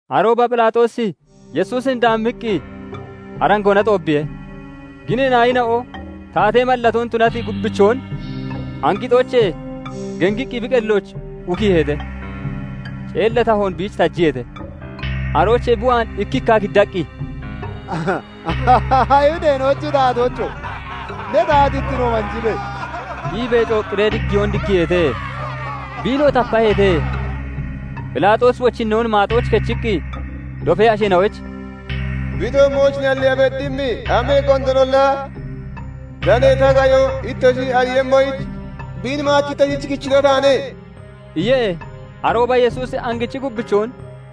Arooba Phelaaxoosi Yesuusin daammiqqi arangoona xoobbiihe. Ginee naayina'o taatee mallatoon tunati gubbichoon angixoochee gengiqqi bi qellooch ukiiheete; ceella tahoon biich tajiyeete; Aroochee bi waan ikki ikka giddaqqi, "Ayihudeena'ochi taatoocho! Ne taatittino manjibe!" iibee cooqqiree diggiyoon diggiiheete; biinoo tapaheete. Phelaaxoosi wochinnoon maaxooch kechiqqi dofee asheena'oyich "Bi toommooch nalliiya beddimmi amee gondoonolla danee ta qayon ittoshi ariiyemmoyich, biin maach ittoshich kichito taane" iye. Arooba Yesuusi angichi gubbichoon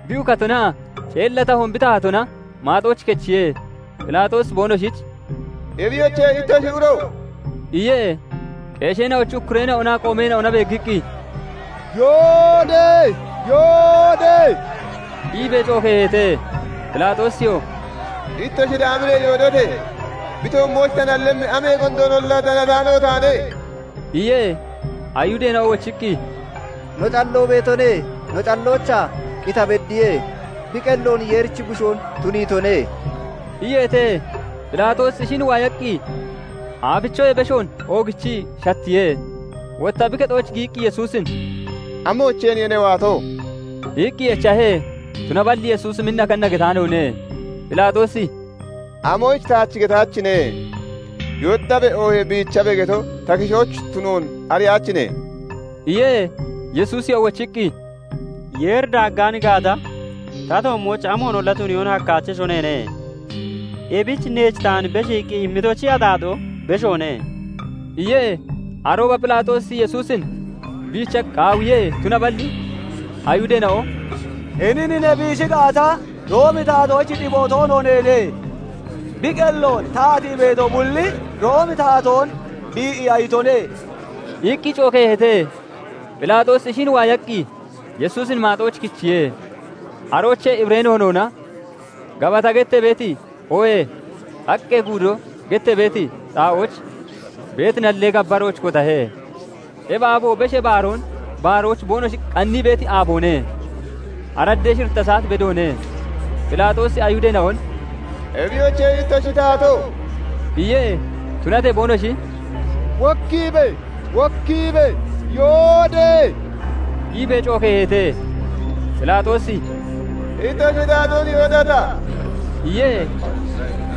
bi ukatonaa ceella tahoon bi tahatona maaxooch kechiye; Phelaaxoosi boonoshich "Ebiyoche, ittoshi uro!" iye. Qeesheena'ochi ukkureena'onaa qoomeena'ona beeggiqqi, "Yoode! Yoode!" iibee cookeeheete. Phelaaxoosiyoo "Ittoshi daamiree yoodote! Bi toommooch ta nallemmi amee gondoonolla danataano taane" iye. Ayihudeena'o wochiqqi, "No calloo beetone; no calloochaa qita beddiye; bi qelloon Yeerichi Bushoo tuniitone" iyeete. Phelaaxoosi ishin waayaqqi aafichoyee beshoon oogichii shattiye; Wottaa bi kexooch giyiqqi Yesuusin "Amoocheeniye ne waato?" iqqi echahe. Tunaballi Yesuusi minna kanna getaanoone. Phelaaxoosi "Amoyich taach getaachine? 'Yooddabe' oohee 'Biichabe' geto ta kishooch tunoon ariyaachine?" iye. Yesuusiyoo wochiqqi, "Yeeri daaggaan gaata, ta toommooch amoonolla tuniyoon hakkaachesho neene; ebich neech taan beshiiqqi immitochi axaaxoo beshoone" iye. Arooba Phelaaxoosi Yesuusin biicha qaawiye; tunaballi Ayihudeena'o "Hinin ne biishi gaata, Roomi Taatoochi xiboo toono neene; bi qelloon taatii beeto bulli Roomi Taatoon bii'iya itone" iqqi cookeeheete. Phelaaxoosi ishin waayaqqi Yesuusin maaxooch kichiye; aroochee Hibiree noonoona "Gabata" gettee beeti oohee "Xaqqee godo" gettee beeti xaa'ooch beeti nallee gabbarooch kotahe. Ebi aabo, Beshee Baaroon baaroyich boonoshi qannii beeti aaboone; araddee shiritta saat bedoone. Phelaaxoosi Ayihudeena'on "Ebiyoche, ittoshi taatoo!" iye. Tunatee boonoshi "Wokkiibe! Wokkiibe! Yoode!" iibee cookeeheete. Phelaaxoosi "Ittoshi taatoon yoodata?" iye.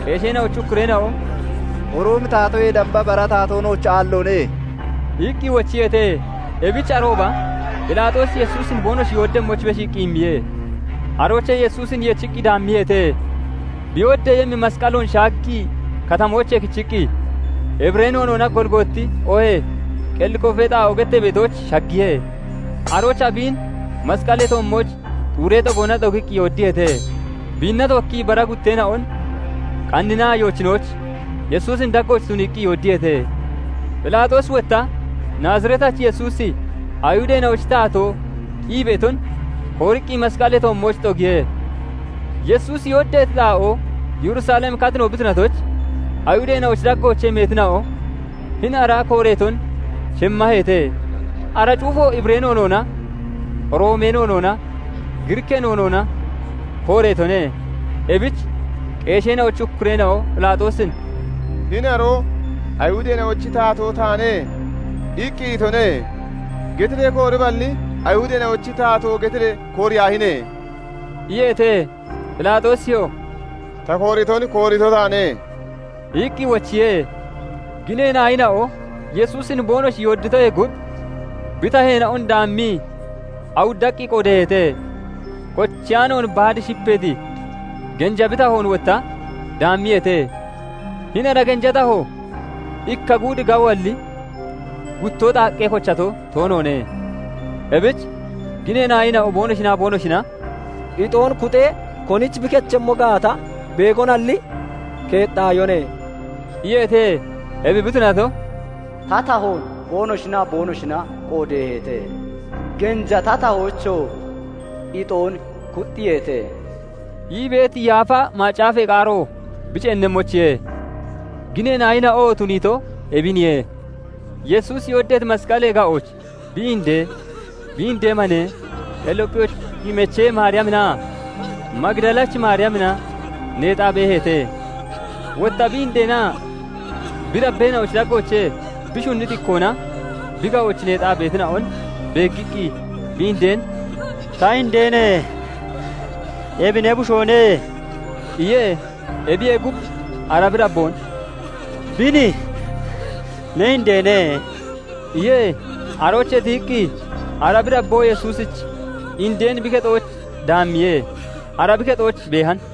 Qeesheena'ochi ukkureena'o "Roomi Taatoyee damba bara taatoo nooch aalloone" iqqi wochiyeete. Ebich arooba Phelaaxoosi Yesuusin boonoshi yooddemmoyich beshiiqqi immiye. Aroochee Yesuusin yechiqqi daammiyeete; bi yooddeeyemmi masqalloon shaaggii katamoochee kechiqqi Hibiree noonoona "Golgooti" oohee "Qellee Koofee Xaa'oo" gettee beetooch shaggiye. Aroochaa biin masqalee toommooch xuuree xogoona xogiqqi yooddiyeete; biinna tookkii bara gutteena'on qanninaa yoochinooch, Yesuusin daggooch tuniiqqi yooddiyeete. Phelaaxoosi wotta "Naazireetachi Yesuusi, Ayihudeena'ochi Taatoo" ii beeton kooriiqqi masqalee toommooch xogiihe. Yesuusi yooddeeti xaa'oo Yerusalem katino bi tunatoyich, Ayihudeena'ochi daggoochee meetina'o hini ara kooreeton shemmaheete; ara cuufo Hibiree noonoona, Roomee noonoonaa Giriikkee noonoona kooreetone. Ebich qeesheena'ochi ukkureena'o Phelaaxoosin " 'Hini aroo "Ayihudeena'ochi taatoo taane" iqqi itone' getiree kooriballi, 'Ayihudeena'ochi Taatoo' getiree kooriyaahine!" iyeete. Phelaaxoosiyoo "Ta kooriton koorito taane" iqqi wochiye. Ginee naayina'o Yesuusin boonoshi yoodditoyee gub, bi taheena'on daammii awuddaqqi qoodeeheete. Kocheyaanoon baad shipeeti genja bi tahoon wotta daammiyeete. Hini ara genja taho ikka guud gawoalli, gutto xaaqqee kocheeto toonoone. Ebich ginee naayina'o boonoshinaa boonoshina "Ixoon (koshoon) kuxee konich bi kechemmo gaata, beegonalli keexxaayone" iyeete. Ebi bi tunato, "Ta tahoon boonoshinaa boonoshina qoodeeheete; Genja ta tahoochoo ixoon kuxxiyeete" ii beeti Yaafa Macaafee qaaro bi ceennemmoyichiye. Ginee naayina'oo tuniito ebiniye. Yesuusi yooddeeti masqalee ga'ooch bi inde, bi indee mane, qelliyoopphichi mechee Maariyaminaa Magidalachi Maariyamina neexaa beeheete. Wotta bi indeenaa bi dabbeena'ochi daggoochee bi shunniti ikkoona bi ga'ooch neexaa beetina'on beeggiqqi, bi indeen "Ta indeene! Ebi ne bushoone" iye. Ebiyee gub, ara bi dabboon "Bini ne indeene" iye. Aroochee tiyiqqi ara bi dabboo Yesuusichi indeen bi kexooch daammiye; ara bi kexooch beehan.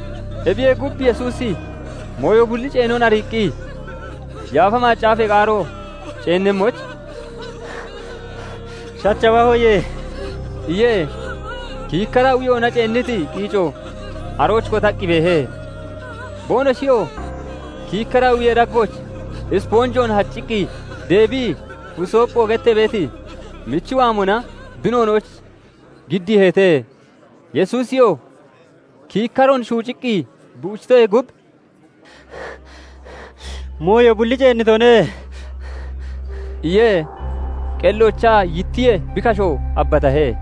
Ebiyee gub, Yesuusi mooyo bulli ceenon ariiqqi, Yaafa Macaafee qaaro ceennemmoyich "Shachawahoye" iye. Kiikkara uyoona ceenniti qiico arooch kotaqqi beehe; boonoshiyoo kiikkara uyee daggooch isponjoon hacciqqi deebii "Husoopho" gettee beeti michi waamona bi noonooch giddiiheete. Yesuusiyoo kiikkaroon shuuciqqii bi uchitoyee gub, "Mooyo bulli ceennitone" iye; qelloochaa yittiye; bi kashoo abbatahe.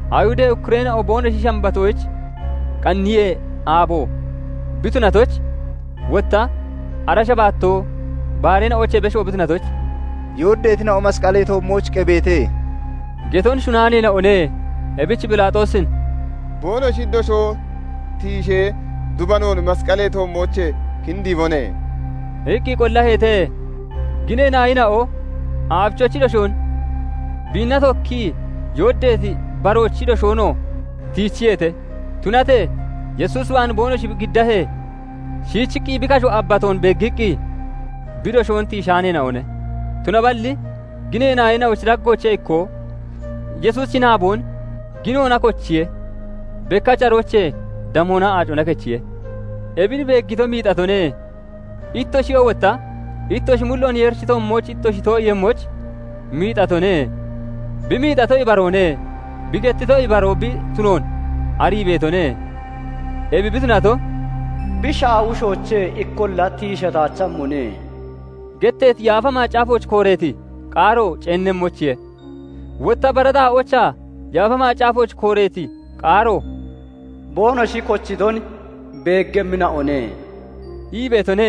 Ayihudee ukkureena'o boonoshi Shambatoyich Qanniyee Aabo bi tunatoyich, wotta ara Shambatoo bareena'oochee besho bi tunatoyich, "Yooddeetina'o masqalee toommooch qebeete" geton shunnaaneena'one. Ebich Phelaaxoosin "Boonoshi doshoo tiishee, dubanoon masqalee toommoochee kindiibone" iqqi qollaheete. Ginee naayina'o aafichochi doshoon, biinna tookkii yooddeeti baroochi doshoonoo tiichiyeete; Tunatee Yesuus waan boonoshi giddahee, shiichiqqi bi kasho abbatoon beeggiqqi bi doshoon tiishaaneena'one. Tunaballi ginee naayina'ochi daggoochee ikkoo Yesuusichi naaboon ginoona kochiye; bekkach aroochee damoonaa aacona kechiye. Ebin beeggito miixatone; ittoshiyoo wotta ittoshi mulloon Yeerichi toommooch ittoshi too'iiyemmoyich miixatone; bi miixato ibaroone; bi gettitoo ibaroo bi tunoon arii beetone. Ebi bi tunato, "Bi shaawushoochee ikkoolla tiishataachemmone" getteeti Yaafa Macaafooch kooreeti qaaro ceennemmoyichiye. Wotta bara xaa'oochaa Yaafa Macaafooch kooreeti qaaro "Boonoshi kochiton beeggemmina'one" ii beetone.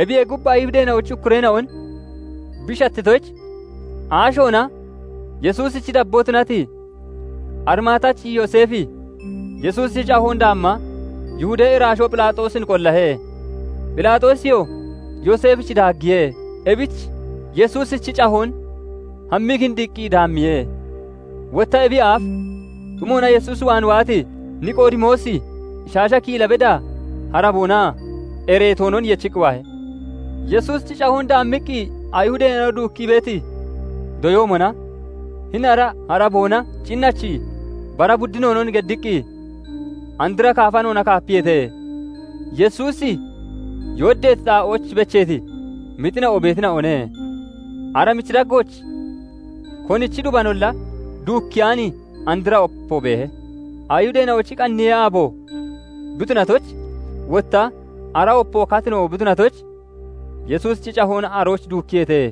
Ebiyee gub, Ayihudeena'ochi ukkureena'on bi shattitoyich, aashoona Yesuusichi dabboo tunati Arimaatachi Yooseefi Yesuusichi cahoon daamma Yihudee iraashoo Phelaaxoosin qollahe; Phelaaxoosiyoo Yooseefich daaggiye. Ebich Yesuusichi cahoon hammii kindiiqqi daammiye. Wotta ebiyee aaf xumoona Yesuus waan waati Niqoodimoosi shaasha kiila beda haraboonaa ereetoonon yechiqqi waahe. Yesuusichi cahoon daammiqqi Ayihudeena'o duukkee beeti doyoomona hini ara haraboonaa cinnachi bara buddinoonon geddiqqi andra kaafanoona kaapiyeete. Yesuusi yooddeeti xaa'ooch becheeti mixina'o beetina'one; ara michi daggooch konichi dubanolla duukkeyaani andra opo beehe. Ayihudeena'ochi Qanniyee Aabo bi tunatoyich, wotta ara opo katino bi tunatoyich, Yesuusichi cahoon arooch duukkiyeete.